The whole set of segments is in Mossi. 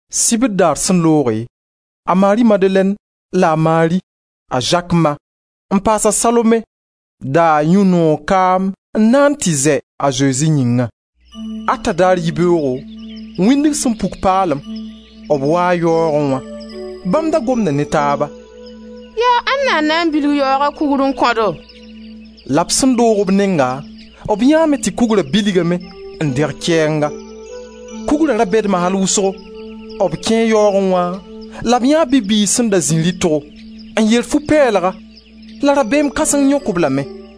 Sibri daar sẽn looge, a Mari Madelɛn la a Mari, a Zak ma, n paas a Salome, daa yũ-noog kaam n na n tɩ zɛ a Zezi yĩnga. Ata daar yibeoogo, wĩndg sẽn puk paalem, b waa yaoogẽ wã. Bãmb da gomda ne taaba: «Yaa ãnna n na n bilg yaooga kugr n kõ-do?» La b sẽn doog b nenga b yãeeme tɩ kugra billgame n dɩg kɛɛnga. Kugra ra bɛdma al wʋsgo. B kẽe yaoogẽ wã la b yãee bi-bɩɩg sẽn da zĩ rɩtgo n yer fu pɛɛlga la rabeem kãseng yõk-b lame.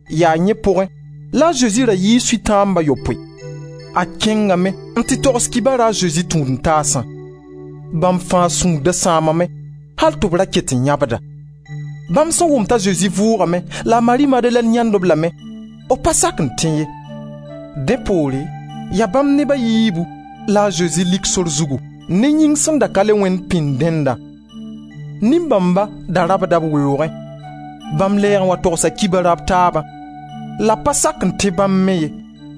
Yaa yẽ pʋgẽ la a Zezi ra yiis Sʋtãamb a yopoe. A kẽngame n tɩ togs kibarã a Zezi tũud-n-taasã. Bãmb fãa sũr da sãamame al tɩ b ra ket n yãbda. Bãmb sẽn wʋm t'a Zezi vʋʋgame la a Mari Madelɛn yãend-b lame, b pa sak n tẽ ye. Dẽ poore, yaa bãmb neb a yiibu la a Zezi lik sor zugu ne yĩng sẽn da ka le wẽnd pind dẽnda; nin-bãmb da rabda b weoogẽ. Bãmb lɛɛg n wa togsa kibarã b taaba la b pa sak n tẽ bãmb me ye.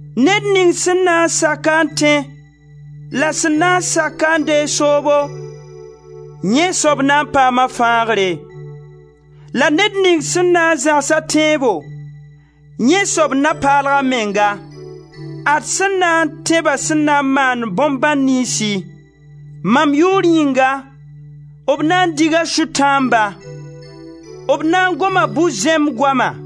Ned ninga sẽn na n saka n tẽ, la sẽn na n saka n deeg soobo, yẽ soab na n paama fãagre. La ned ning sẽn na n zãgsa tẽebo, yẽ soab na palga a menga. Ad sẽn na n tẽbã sẽn na n maam bõn-bãn niynsi: mam yʋʋr yĩnga, b na n diga sʋtãamba. B na n goma bu-zẽmb goama.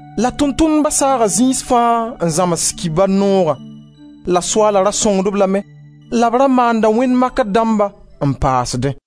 La Tʋʋm-tʋmdba saaga zĩis fãa n zãms Kibar noogã, la Soaala ra sõngd-b lame, la b da maanda wẽnd makr dãmba n paasdẽ.]